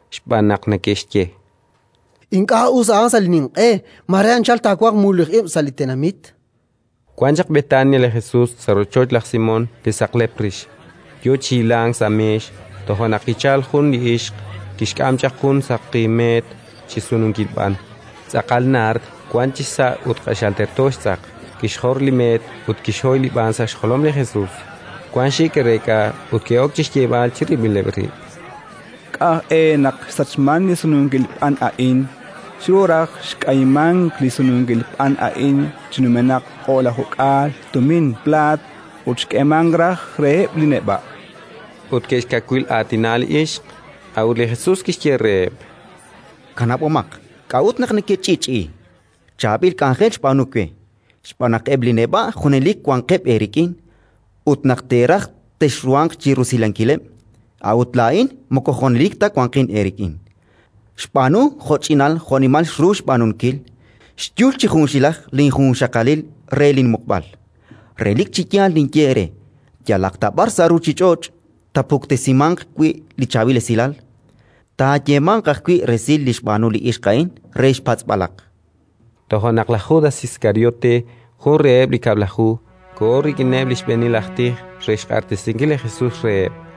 Xb'aan naq neke'xye: —Ink'a' us a'an sa' li ninq'e; mare anchal taawanq mululij ib' sa' li tenamit. Wan chaq Betania li Jesus, sa' rochoch laj Simón li saqlep rix, yo chi hilank sa' meex. Toja' naq kichalk jun li ixq: kixk'am chaq jun saqi meet chi sununkil b'an, tz'aqal naard wank chisa' ut q'axal terto xtz'aq; kixjor li meet ut kixhoy li b'an sa' xjolom li Jesus. Wan xik' ke'reek'a ut ke'ok chi xyeeb'al chirib'ileb' rib': —K'a' aj e naq xsachmank li sununkil b'an a'in? Xru raj xk'ayimank li sununkil b'an a'in chi numenaq o'lajuk'aal tumin plaat ut xk'eemank raj reheb' li neb'a'. Ut ke'xkawil'aatina li ixq. A'ut li Jesus kixye reheb': —Kanab'omaq. K'a'ut naq nekech'i'ch'i'i? Chaab'il k'anjel xb'aanu we. Xb'aan naq eb' li neb'a' junelik wanqeb' eerik'in ut, naq teeraj, texruhanq chi rusilankileb'; a'ut laa'in moko junelik ta wanqin eerik'in. Xb'aanu jo'ch'inal jo'nimal xru xb'aanunkil: xyul chi junxilaj linjunxaqalil re linmuqb'al. Relik chi yal ninye eere: yalaq ta b'ar sa' ruuchich'och' taapuktesimanq wi' li Chaab'il Esilal, taayeemanq ajwi' resil li xb'aanu li ixq a'in re xpatz'b'alaq. Toja' naq laj Judas Iskariote, jun reheb' li Kab'laju, koho rik'ineb' li xb'eenil aj tij re xq'axtesinkil li Jesus reheb'.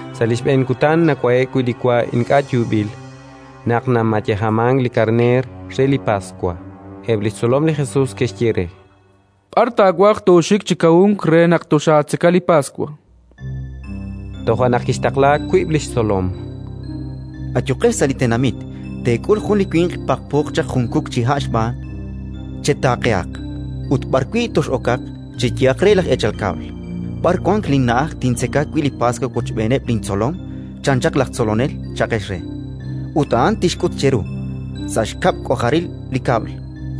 Sa' li xb'een kutan nawa'e'k wi' li wa ink'a' yuub'il, naq namayejamank li karneer re li Paswa, eb' li xtzolom li Jesus ke'xye re: —B'ar taawaj tooxik chi kawunk re naq toxaatzeka li Paswa? Toja' naq kixtaqla wiib' li xtzolom: —Ayuqex sa' li tenamit, chan reheb'. Teek'ul jun li winq paqpooq chaq jun kuk chi ha' xb'aan; chetaaqehaq ut, b'arwi' tox'okaq, cheyehaq re laj eechal kab'l: «B'ar wank linna'aj tintzeka wi' li Paswa wochb'eeneb' lintzolom? chan chaq laj Tzolonel», cha'qex re. Ut a'an tixk'ut cheru, sa' xkab' xk'ojaril li kab'l,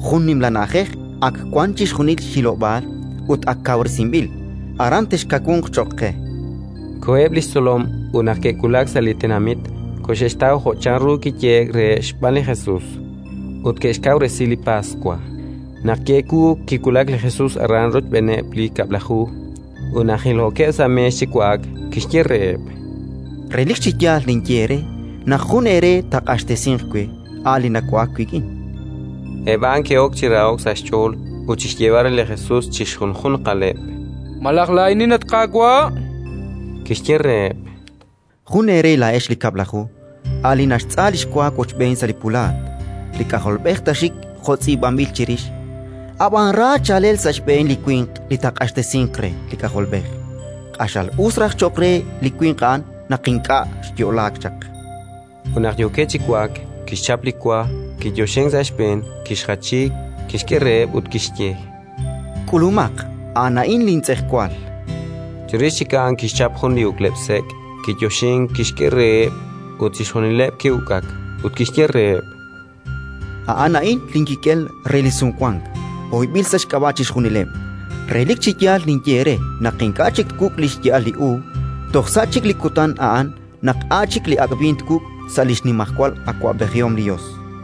jun nimla na'ajej, ak wank chixjunil xhilob'aal ut ak kawresinb'il: aran texkawunq cho'q qe. Koheb' li xtzolom ut, naq ke'wulak sa' li tenamit, koxe'xtaw jo' chanru kiyehe'k reheb' xb'aan li Jesus, ut ke'xkawresi li Paswa. Naq ki'ewuuk, kiwulak li Jesus aran rochb'eeneb' li Kab'laju. Ut naq hilhookeb' sa' meex chi wa'ak, kixye reheb': —Relik chi yaal ninye eere naq jun eere taaq'axtesinq we, a' li nawa'ak wik'in. Eb' a'an ke'ok chi raho'k sa' xch'ool ut chi xyeeb'al re li Jesus chi xjunjunqaleb': —Malaj laa'inin, at Qaawa'? Kixye reheb': —Jun eere laa'ex li Kab'laju, a' li naxtz'a li xwa wochb'een sa' linpulaat. Li K'ajolb'ej taaxik jo' tz'iib'anb'il chirix, ab'an ra chaalel sa' xb'een li winq li taaq'axtesinq re li K'ajolb'ej! Q'axal us raj cho'q re li winq a'an naq ink'a' xyo'laak chaq. Ut naq yookeb' chi wa'ak, kixchap li wa, kiyoxink sa' xb'een, kixjachi, kixk'e reheb' ut kixye: —K'ulumaq, a'an a'in lintz'ejwal. Chirix chik a'an kixchap jun li uk'leb'-sek', kiyoxink, kixk'e reheb', ut chixjunileb' ke'uk'ak. Ut kixye reheb': —A'an a'in linkik'el re li Sumwank, hoyb'il sa' xk'ab'a' chixjunileb'. Relik chi yaal ninye eere naq ink'a' chik twuk' li xya'al li uub' toj sa' chik li kutan a'an naq a' chik li ak' b'iin twuk' sa' li xnimajwal awab'ejihom li Yos.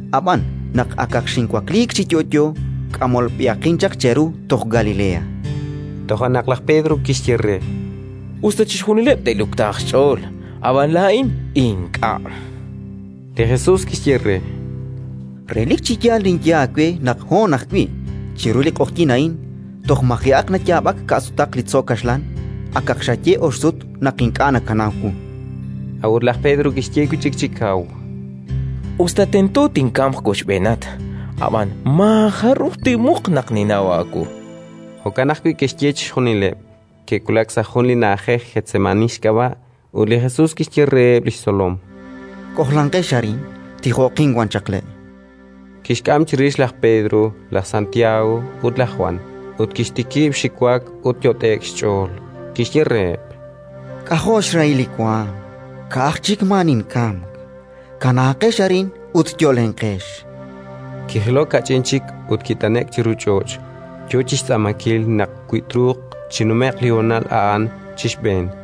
Ab'an, naq akaq xinwakliik chi yo'yo, k'amolb'ehaqin cheru toj Galilea. Toja' naq laj Pedro kixye re: —Us ta chixjunileb' te'luktaaq xch'ool, ab'an laa'in ink'a'. Li Jesus kixye re: —Relik chi yaal ninye aawe naq hoon ajwi', chiru li q'oqyink a'in, toj maji'aq nayaab'ak ka'sutaq li tzo' kaxlan, akaq xaye ox sut naq ink'a' nakanaw wu. A'ut laj Pedro kixye wi' chik chi kaw: —Us ta tento tinkamq wochb'eenat, ab'an maajaruj tinmuq naq ninnaw aawu. Jo'kan ajwi' ke'xye chixjunileb'. Ke'wulak sa' jun li na'ajej Getsemaní xk'ab'a', ut li Jesus kixye reheb' li xtzolom: —K'ojlanqex arin, tijoqin wan chaq le'. Kixk'am chirix laj Pedro, laj Santiago ut laj Jwan, ut kixtikib' xiwak ut yot'e'k xch'ool: Kixye reheb': —K'ajo' xrahil li waanm, ka'aj chik maa ninkamk! Kanaaqex arin ut yo'lenqex. Kijilok kach'in chik ut kit'ane'k chiru ch'och', yo chi xtz'aamankil naq, wi truuq, chinume'q li honal a'an chi xb'een.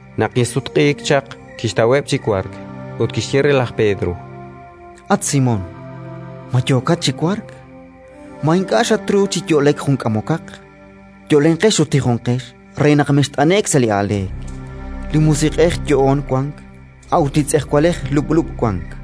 Naq kisutq'iik chaq, kixtaweb' chi wark; ut kixye re laj Pedro: —At Simón, ma yookat chi wark? Ma ink'a' xatruuk chi yo'lek jun k'amokaq? Yo'lenqex ut tijonqex re naq mext'ane'k sa' li aaleek: li musiq'ej yo'oon wank, a'ut li tz'ejwalej lub'lub' wank.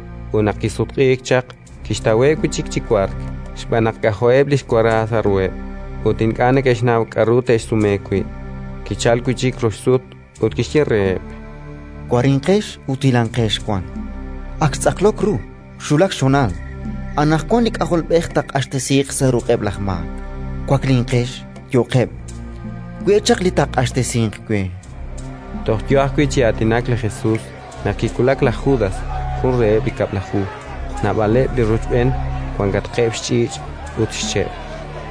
Ut naq kisutq'iik chaq, kixtaweb' wi' chik chi wark, xb'aan naq k'ajo'eb' li xwara sa' ruheb', ut ink'a' neke'xnaw k'aru te'xsume wi'. Kichalk wi' chik rox sut ut kixye reheb': —Warinqex ut hilanqex wan. Ak xtz'aqlok ru, xwulak xhonal: anaqwan li K'ajolb'ej taaq'axtesiiq sa' ruq'eb' laj maak. Waklinqex! Yo'qeb'! We' chaq li taaq'axtesinq we. Toj yo ajwi' chi aatinak li Jesus, naq kiwulak laj Judas, jun reheb' li Kab'laju. Naab'aleb' li rochb'een, wankatqeb' xch'iich' ut xche',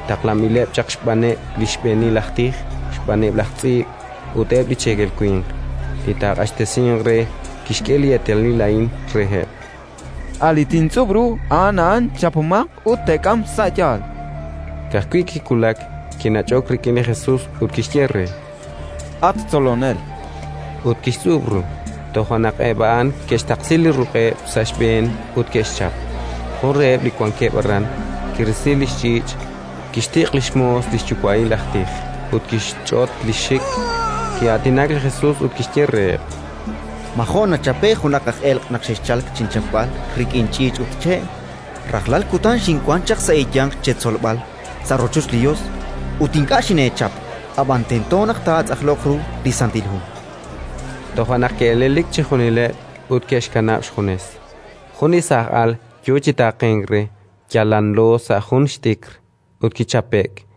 taqlanb'ileb' chaq xb'aaneb' li xb'eenil aj tij, xb'aaneb' laj tz'iib' ut eb' li cheekel winq. Li taaq'axtesinq re kixk'e li eetalil a'in reheb': “A' li tintz'ub' ru, a'an a'an. Chapomaq ut teek'am sa' yaal”. Ka'ajwi' kiwulak, kinach'ok rik'in li Jesus ut kixye re: —At Tzolonel! Ut kixtz'ub' ru. Toja' naq eb' a'an ke'xtaqsi li ruq'eb' sa' xb'een ut ke'xchap. Jun reheb' li wankeb' aran, kirisi li xch'iich', kixtiq' li xmoos li xyuwa'il aj tij ut kixch'ot li xxik. Ki'aatinak li Jesus ut kixye reheb': —Ma jo' nachape'k junaq aj elq' naq xexchalk chinchapb'al rik'in ch'iich' ut che'? Rajlal kutan xinwank chaq sa' eeyanq cheetzolb'al sa' rochoch li Yos, ut ink'a' xineechap. Ab'an tento naq taatz'aqloq ru li Santil Hu. Toja' naq ke'elelik chixjunileb' ut ke'xkanab' xjunes. Jun li saaj al yo chi taaqenk re, yal lanlo sa' jun xt'ikr; ut kichape'k.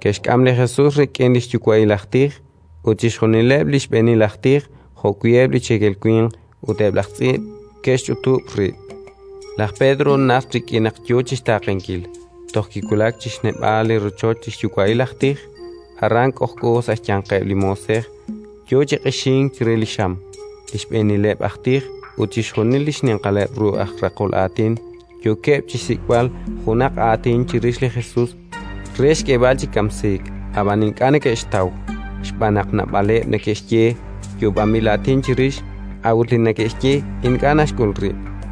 Ke'xk'am li Jesus rik'in li xyuwa'il aj tij. Ut chixjunileb' li xb'eenil aj tij, jo'wi' eb' li cheekel winq ut eb' laj tz'iib' ke'xch'utub' rib'. Laj Pedro najt rik'in naq yo chi xtaaqenkil, toj kiwulak chi xneb'aal li rochoch li xyuwa'il aj tij; aran, k'ojk'o sa' xyanqeb' li moosej, yo chi q'ixink chire li xam. Li xb'eenileb' aj tij ut chixjunil li xninqaleb' ru aj raqol aatin yookeb' chi xsik'b'al junaq aatin chirix li Jesus re xk'eeb'al chi kamsiik, ab'an ink'a' neke'xtaw, xb'aan naq naab'aleb' neke'xye yoob'anb'il aatin chirix, a'ut li neke'xye ink'a' naxk'ul rib'.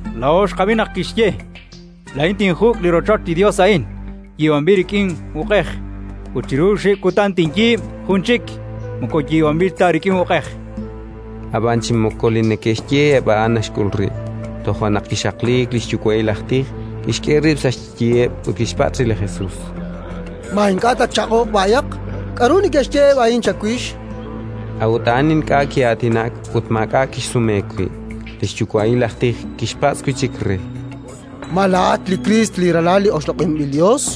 —Laa'o xqab'i naq kixye: «Laa'in tinjuk' li rochoch li Yos a'in yiib'anb'il chi uq'mej, ut chiru oxib' kutan tinyiib' jun chik moko yiib'anb'il ta rik'in uq'ej». Ab'an chi moko li neke'xye eb' a'an naxk'ul rib'. Toja' naq kixaqliik li xyuwa'il aj tij, kixk'e rib' sa' xyiheb' ut kixpatz' re li Jesus: —Ma ink'a' tatchaq'oq b'ayaq? K'aru neke'xye eb' a'in chawix? A'ut a'an ink'a' ki'aatinak ut maak'a' kixsume wi'. Li xyuwa'il aj tij kixpatz' wi' chik re: —Ma laa'at li Kriist, li Ralal li oxloq'inb'il Yos?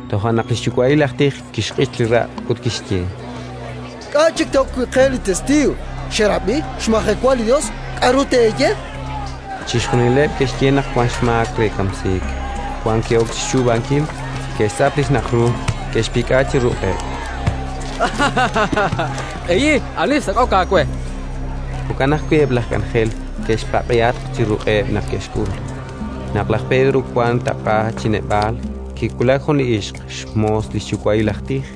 Toja' naq li xyuwa'il aj tij kixq'ich li raq' ut kixye: —K'a' chik te'ok wi' qe li testiiw? Xerab'i, xmajewa li Yos. K'aru teeye? Chixjunileb' ke'xye naq wank xmaak re kamsiik. Wan ke'ok chi xchuub'ankil, ke'xtz'ap li xnaq' ru, ke'xpik'a chi ruq'eb': —Q'ehi: ani xsak'ok aawe, chankeb' re. Jo'kan ajwi' eb' laj k'anjel ke'xpaq'ihatq chi ruq'eb' naq ke'xk'ul. Naq laj Pedro wank taq'a chi neb'aal, kiwulak jun li ixq, xmoos li xyuwa'il aj tij.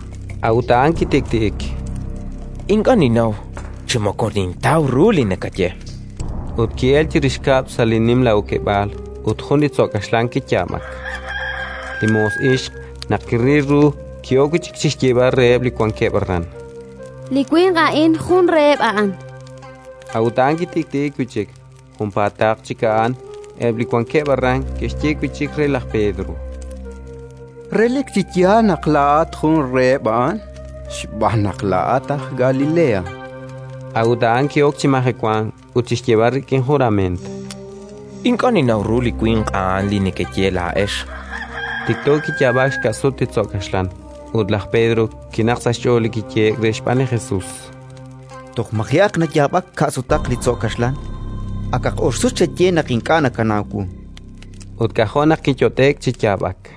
A'ut a'an kitik'ti'ik: —Ink'a' ninnaw chi moko nintaw ru li nakaye. Ut ki'elk chirix kab'l sa' li nimla okeb'aal, ut jun li tzo' kaxlan kiyaab'ak. Li moos ixq, naq kiril ru, ki'ok wi' chik chi xyeeb'al reheb' li wankeb' aran: —Li winq a'in jun reheb' a'an. A'ut a'an kitik'ti'ik wi' chik. Junpaataq chik a'an, eb' li wankeb' aran ke'xye wi' chik re laj Pedro: —Relik chi yaal naq laa'at jun reheb' a'an, xb'aan naq laa'at aj Galilea. A'ut a'an ki'ok chi majewank ut chi xyeeb'al rik'in jurament: —Ink'a' ninnaw ru li winq a'an li nekeye laa'ex! Tikto kiyaab'ak xka' sut li tzo' kaxlan. Ut laj Pedro kinaqk sa' xch'ool li kiyehe'k re xb'aan li Jesus: “Toj maji'aq nayaab'ak ka' sutaq li tzo' kaxlan, akaq ox sut xaye naq ink'a' nakanaw wu”. Ut k'ajo' naq kiyot'e'k chi yaab'ak.